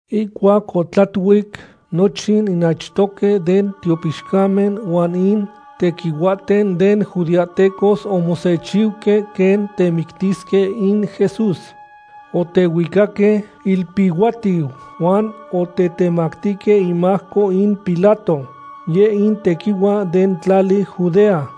Ihcuac otlatuic, nochin in achtohque den tiopixcamen huan in tequihuahten den judeahtecos omosechiuque quen temictisque in Jesús. Otehuicaque ilpihuatiu huan otetemactihque imajco in Pilato, yeh in tequihua den tlali Judea.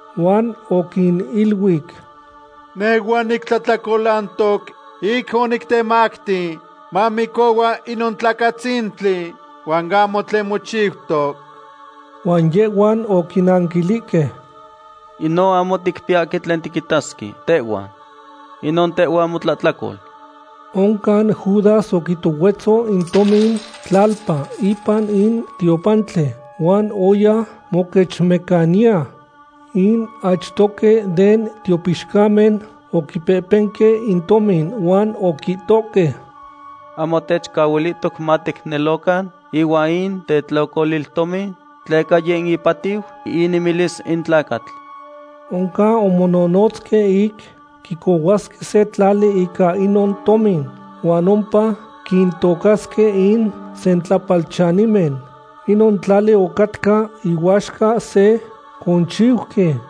Huan oquiniluic: ―Nehhua nitlahtlacolantoc ic onitetemacti mamicohua inon tlacatzintli huan ahmo tlen mochiutoc. Huan yehhuan oquinanquilihque: ―Inon ahmo ticpiyahque tlen tiquitasque tehhuan. ¡Inon tehhua motlahtlacol! Oncan Judas oquitohuetzo in tomin tlalpa ipan in tiopantli, huan oya moquechmecaniya. In achtohque den tiopixcamen oquipehpenque in tomin huan oquihtohque: ―Ahmo techcahuilihtoc maticnelocan ihuan in tetlocoliltomin, tleca yeh in ipatiu inemilis in tlacatl. Oncan omononotzque ic quicohuasque se tlali ica inon tomin. Huan ompa quintocasque in sentlapalchanimen. Inon tlali ocatca ihuaxca se conchiuqui.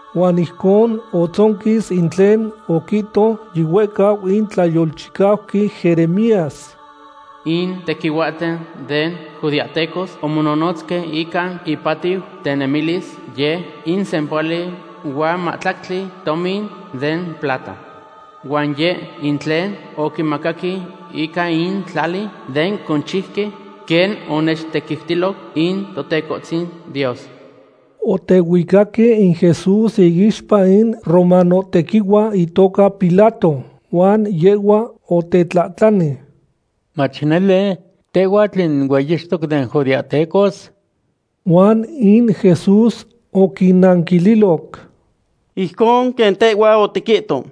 Huan ijcon otzonquis in tlen oquihto yihuehcau in tlayolchicauqui Jeremías: “In tequihuahten den judeahtecos omononotzque ica ipatiu tenemilis yeh in sempohuali huan mahtlactli tomin den plata. Huan yeh in tlen oquimacaque ica in tlali den conchiuqui, quen onechtequiutilo in Totecohtzin Dios.” Otehuicaque in Jesús iixpa in romanohtequihua itoca Pilato, huan yehhua otetlahtlani: ―¿Mach nele, tehhuatl in hueyixtoc den judeahtecos? Huan in Jesús oquinanquililoc: ―Ijcon quen tehhua otiquihto.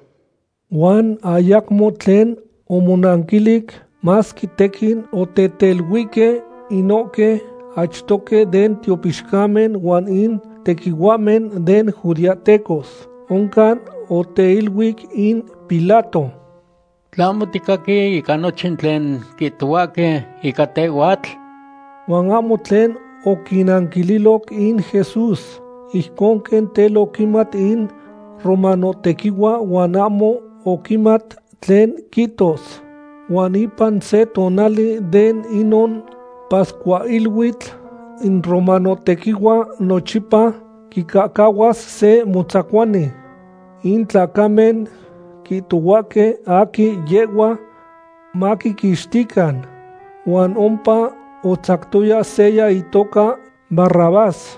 Huan ayacmo tlen omonanquilic, masque tequin oteteluihque inohque achtohque den tiopixcamen huan in tequihuahmen den judeahtecos. Oncan oteiluic in Pilato: ―¿Tlahmo ticaqui ica nochin tlen quihtohuahque ica tehhuatl? Huan ahmo tlen oquinanquililoc in Jesús. Ijcon quen tel oquimat in romanohtequihua huan ahmo oquimat tlen quihtos. Huan ipan se tonali de inon pascuahiluitl, in romanohtequihua nochipa quicahcahuas se motzacuani. In tlacamen quihtohuahque aquin yehhua maquiquixtican. Huan ompa otzactoya seya itoca Barrabás,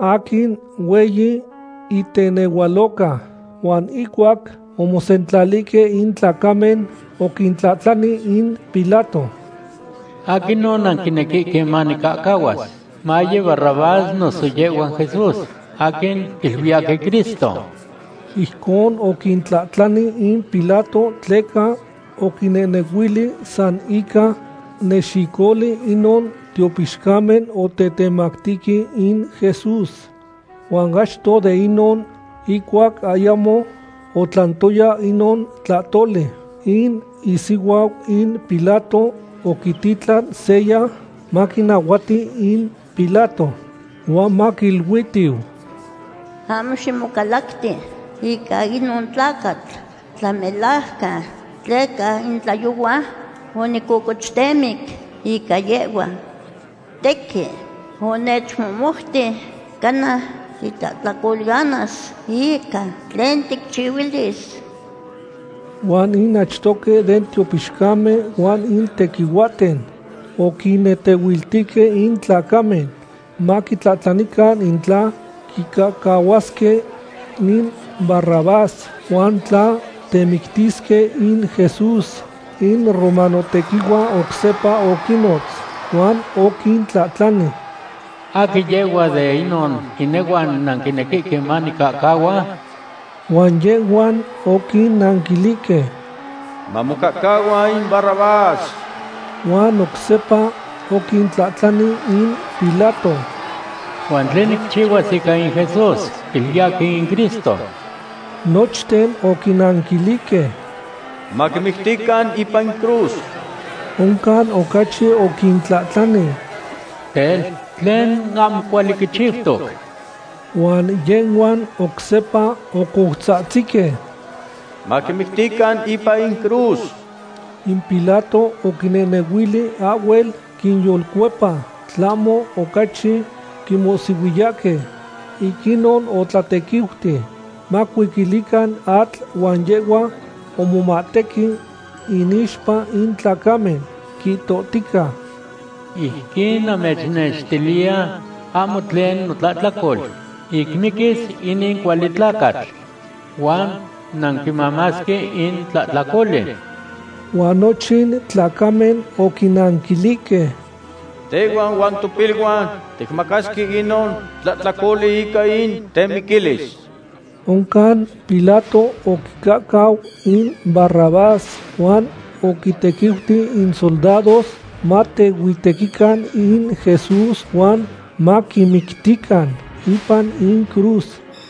aquin hueyi itenehualoca. Huan ihcuac omosentlalihque in tlacamen, oquintlahtlani in Pilato: ―¿Aquinon nanquinequihque nicahcahuas? ¿Maye Barrabás noso yehhua Jesús, aquin quiluiyahque Cristo? Ijcon oquintlahtlani in Pilato tleca oquinehnehuili san ica nexicoli inon tiopixcamen otetemactihque in Jesús. Huan achto de inon, ihcuac ayamo otlantoya inon tlahtoli, in isihuau in Pilato oquititlan seya maquinahuati in Pilato, huan maquiluitiu: “Ahmo ximocalacti ica inon tlacatl tlamelajcan, tleca in tlayohua onimococochtemic ica yehhua. Tequin onechmohmouti cana titlahtlacolanas ica tlen ticchihuilis.” Huan in achtohque den tiopixcamen huan in tequihuahten oquinnetehuiltihque in tlacamen maquitlahtlanican in tla quicahcahuasque in Barrabás huan tla temictisque in Jesús. In romanohtequihua oc sepa oquinnotz, huan oquintlahtlani: ―¿Aquin yehhua den inon inehuan nanquinequihque manicahcahua? Huan yehhuan oquinanquilihque: ―Mamocahcahua in Barrabás. Huan oc sepa oquintlahtlani in Pilato: ―¿Huan tlen nicchihuas ica in Jesús, quiluiyahque in Cristo? Nochten oquinanquilihque: ―¡Maquimictican ipan in cruz! Oncan ocachi oquintlahtlani: ―Tel, ¿tlen ahmo cuali quichiutoc? Huan yehhuan oc sepa ocoutzahtzihque: ―¡Maquimictican ipan in cruz! In Pilato oquinehnehuili ahhuel quinyolcuepa, tlahmo ocachi quimohsihuiyahque. Ic inon otlatequiuti macuiquilican atl huan yehhua omomahtequi inixpa in tlacamen, quihtohtica: ―Ijquin namechnextiliya ahmo tlen notlahtlacol ic miquis inin cuali tlacatl. Huan nanquimamasque in tlahtlacoli. Huan nochin tlacamen oquinanquilihque: ―¡Tehhuan huan topiluan ticmamasque inon tlahtlacoli ica in temiquilis! Oncan Pilato oquicahcau in Barrabás huan oquintequiuti in soldados matehuitequican in Jesús huan maquimictican ipan in cruz.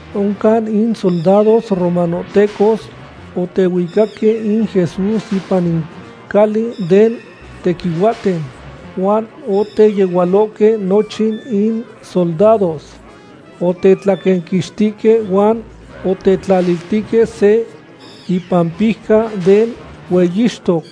Oncan in soldados romanohtecos otehuicaque in Jesús ipan in cali den tequihuahten, huan oteyehualohque nochin in soldados. Otetlaquenquixtihque huan otetlaliltihque se ipampijca den hueyixtoc.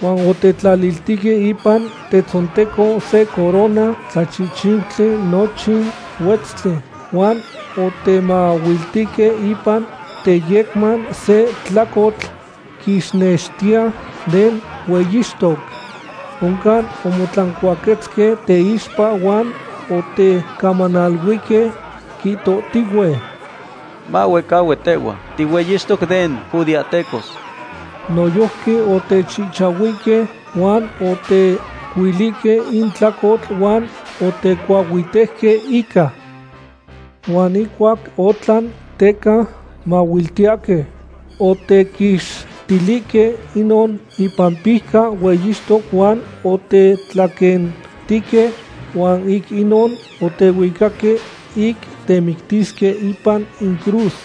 Huan otetlaliltihque ipan tetzonteco se corona tlachihchiutli nochin huetztli, huan otemahuiltihque ipan teyecman se tlacotl quixnextiya den hueyixtoc. Oncan omotlancuaquetzque teixpa huan otecamanaluihque, quihtohtihue: ―¡Mahuehcahui tehhua tihueyixtoc den judeahtecos! Noyojqui otechihchahuihque, huan otecuilihque in tlacotl huan otecuahuitejque ica. Huan ihcuac otlan teca mahuiltiyahque, otequixtilihque inon ipampijca hueyixtoc huan otetlaquentihque. Huan ic inon otehuicahque ic temictisque ipan in cruz.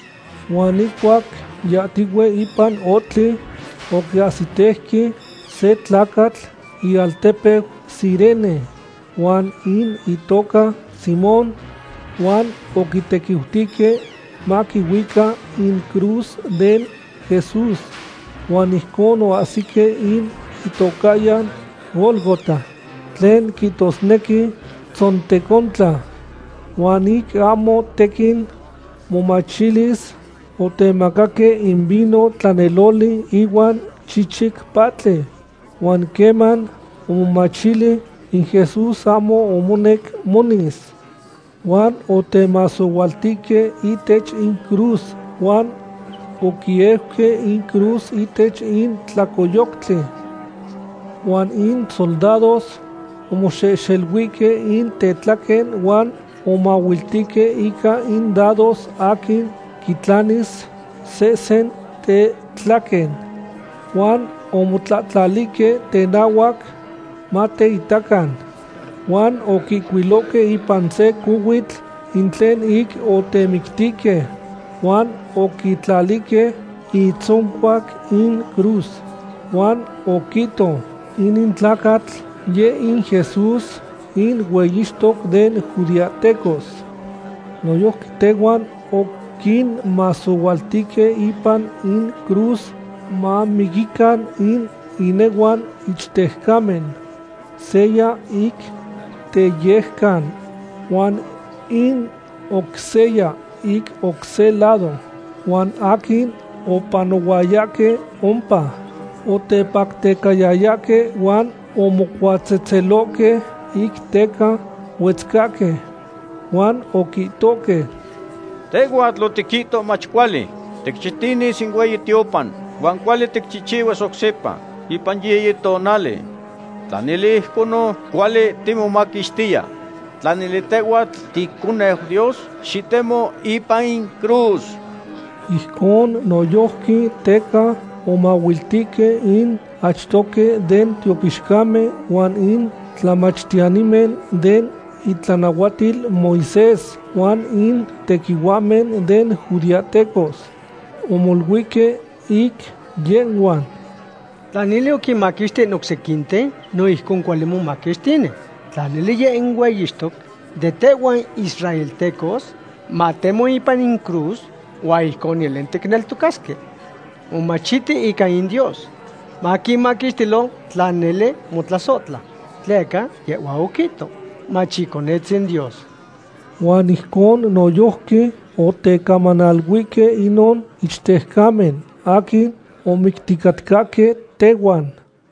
Huan ihcuac yahtihue ipan ohtli, oquiahsitejque se tlacatl ialtepeu Cirene, huan in itoca Simón. Huan oquitequiutihque maquihuica in cruz den Jesús. Huan ijcon oahsique in itocahyan Gólgota, tlen quihtosnequi Tzontecontlan. Huan ic ahmo tequin momachilis, otemacaque in vino tlaneloli ihuan chichic pahtli. Huan queman omomachili, in Jesús ahmo omonec monis. Huan otemasohualtihque ihtech in cruz huan oquieuque in cruz ihtech in tlacoyoctli. Huan in soldados omoxehxeluihque in tetlaquen huan omahuiltihque ica in dados aquin quitlanis sehsen tetlaquen. Huan omotlahtlalihque tenahuac mateitacan. Huan oquihcuilohque ipan se cohuitl in tlen ic otemictihque huan oquitlalihque itzoncuac in cruz. Huan oquihto: “Inin tlacatl, yeh in Jesús in hueyixtoc den judeahtecos.” Noyojqui tehuan oquinmasohualtihque ipan in cruz mamiquican in inehuan ichtejcamen, seya ic teyejcan huan in oc seya ic oc se lado. Huan aquin opanohuayahque ompa otepactecayayahque, huan omocuatzehtzelohque ic teca huetzcahque. Huan oquihtohque: ―Tehhuatl otiquihto mach cuali ticxitinis in hueyi tiopan huan cuali ticchihchihuas oc sepa ipan yiyi tonali. Tla nele ijconon, cuali timomaquixtiya. Tla nele tehhuatl ticoneu Dios, xitemo ipan in cruz. Ijcon noyojqui teca omahuiltihque in achtohque den tiopixcamen huan in tlamachtiyanimen den itlanahuatil Moisés huan in tequihuahmen den judeahtecos. Omoluihque ic yehhuan: ―Tla nele oquinmaquixti in oc sequinten, no ijcon cuali momaquixtini. Tla nele yeh in hueyixtoc den tehhuan israeltecos, matemo ipan in cruz huan ijcon nele ticneltocasque. Omomachiti ica in Dios. Maquimaquixtilo tla nele motlasohtla. Tleca yehhua oquihto mach Iconetzin Dios. Huan ijcon noyojqui otecamanaluihque inon ichtejcamen aquin omicticatcahque tehuan.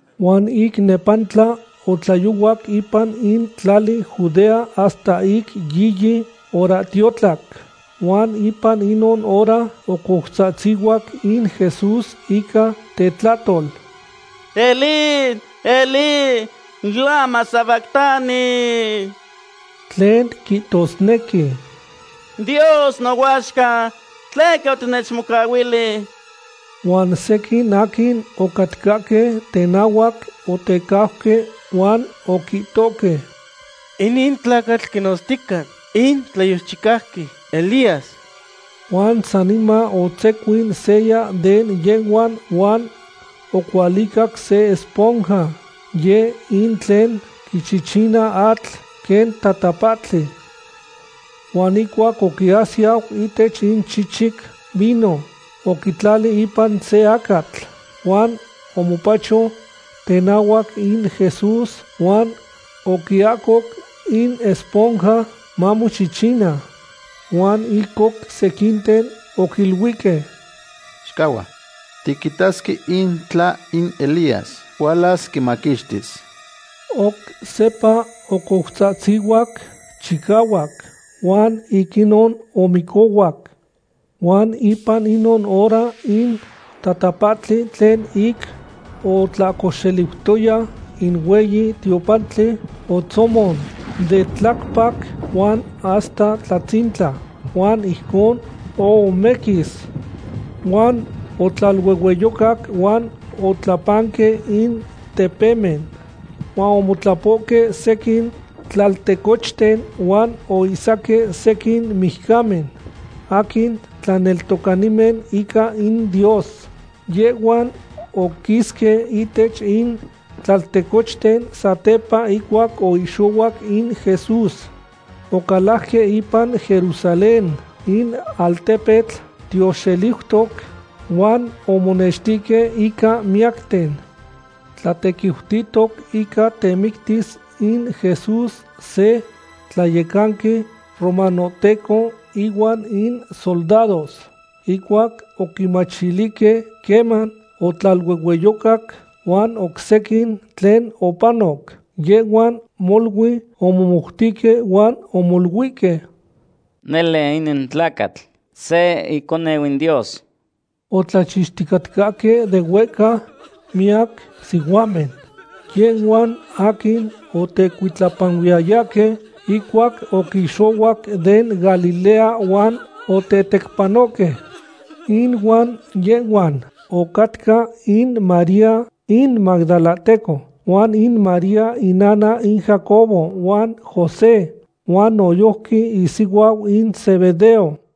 Huan ic nepantla otlayohuac ipan in tlali Judea hasta ic yiyi horahtiotlac. Huan ipan inon hora ocoutzahtzihuac in Jesús ica tetlahtol: ―¡Elí, Elí! ¿lamá sabactani? ―tlen quihtosnequi: Dios nohuaxca, ¿tleca otinechmocahuili? Huan sequin aquin ocatcahque tenahuac otecajque huan oquihtohque: ―Inin tlacatl quinotztica in tlayolchicauqui Elías. Huan saniman otzecuin seya de yehhuan huan ocualicac se esponja. Yeh in tlen quichichina atl quen tatapahtli. Huan ihcuac oquiasiyau ihtech in chichic vino, oquitlali ipan se acatl. Huan omopacho tenahuac in Jesús huan oquiahcoc in esponja mamochichina. Huan in oc sequinten oquiluihque: ―Xicahua. Tiquitasque in tla in Elías hualas quimaquixtis. Oc sepa ocoutzatzihuac chicahuac huan ic inon omicohuac. Huan ipan inon hora in tatapahtli tlen ic otlahcoxeliutoya in hueyi tiopantli otzomon de tlacpac huan hasta tlatzintla huan ijcon ohomequis. Huan otlaluehueyocac huan otlapanque in tepemen. Huan omotlapohque sequin tlaltecochten huan oihsaque sequin mijcamen aquin tlaneltocanimen ica in Dios. Yehhuan oquisque ihtech in tlaltecochten satepa ihcuac oihxohuac in Jesús. Ocalajque ipan Jerusalén, in altepetl tioxeliutoc, huan omonextihque ica miyacten. Tlatequiutihtoc ica temictilis in Jesús se tlayecanqui romanohteco ihuan in soldados. Ihcuac oquimachilihque queman otlaluehueyocac huan oc sequin tlen opanoc, yehhuan molui omomoutihque huan omoluihque: ―Nele inin tlacatl se iconeu in Dios. Otlachixticatcahque de huehca miyac sihuamen, yehhuan aquin otecuitlapanuiyayahque ihcuac oquixohuac den Galilea huan otetecpanohque. Inuan yehhuan ocahcatca in María in magdalahteco, huan in María innana in Jacobo huan José, huan noyojqui isihuau in Zebedeo.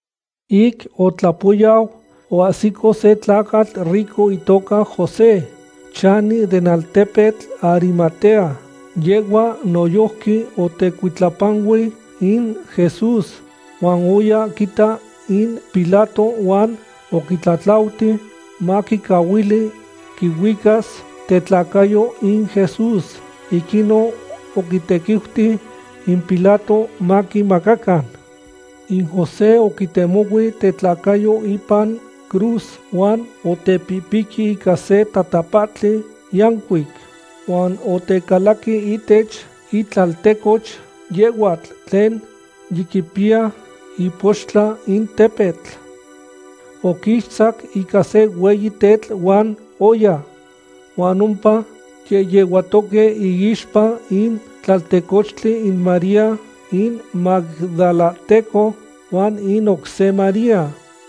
Ic otlapoyau, oahsico se tlacatl rico itoca José, chani den altepetl Arimatea. Yehhua noyojqui otecuitlapanui in Jesús. Huan oya quita in Pilato huan oquitlatlauti maquicahuili quihuicas tetlacayo in Jesús. Ic inon oquintequiuti in Pilato maquimacacan. In José oquitemohui tetlacayo ipan cruz huan otepihpiqui ica se tatapahtli yancuic. Huan otecalaqui ihtech itlaltecoch yehhuatl tlen yiquipiya ipoxtla in tepetl. Oquixtzac ica se hueyi tetl huan oya. Huan ompa yehyehuatoque iixpa in tlaltecochtli in María in magdalahteco huan in oc se María.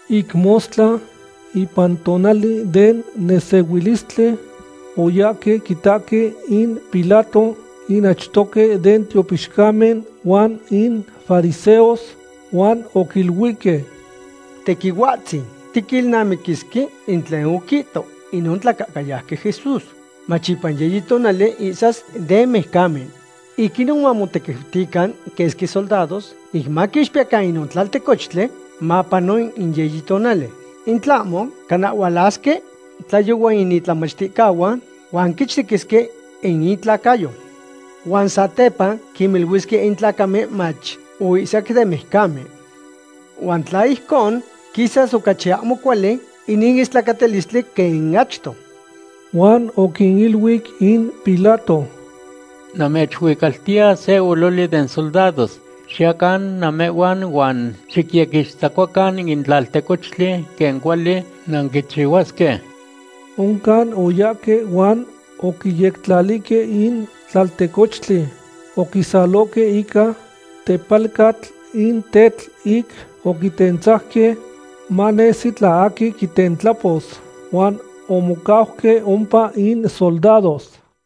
Ic mostla, ipan tonali den nesehuilistli, oyahque quitahque in Pilato in achtohque den tiopixcamen huan in fariseos. Huan oquiluihque: ―Tequihuahtzin, tiquilnamiquisque in tlen oquihto inon tlacahcayauqui Jesús mach ipan yiyi tonali ihsas den mijcamen. Ic inon mamotequiutican quesqui soldados ic maquixpiyecan inon tlaltecochtli mapano in yiyi tonali. In tlahmo, cana hualasque tlayohua in itlamachticahuan huan quichtequisque in itlacayo. Huan satepa quiniluisque in tlacamen mach: “Oihsac den mijcamen.” Huan tla ijcon, quisas ocachi ahmo cuali inin istlacatilistli quen in achto. Huan oquiniluic in Pilato: ―Namechuicaltiya se ololi den soldados. Xiyacan namehhuan huan xicyequixtzacuacan in tlaltecochtli quen cuali nanquichihuasque. Oncan oyahque huan oquiyectlalihque in tlaltecochtli. Oquisalohque ica tepalcatl in tetl ic oquitentzajque, manesi tla aquin quitentlapos. Huan omocauque ompa in soldados.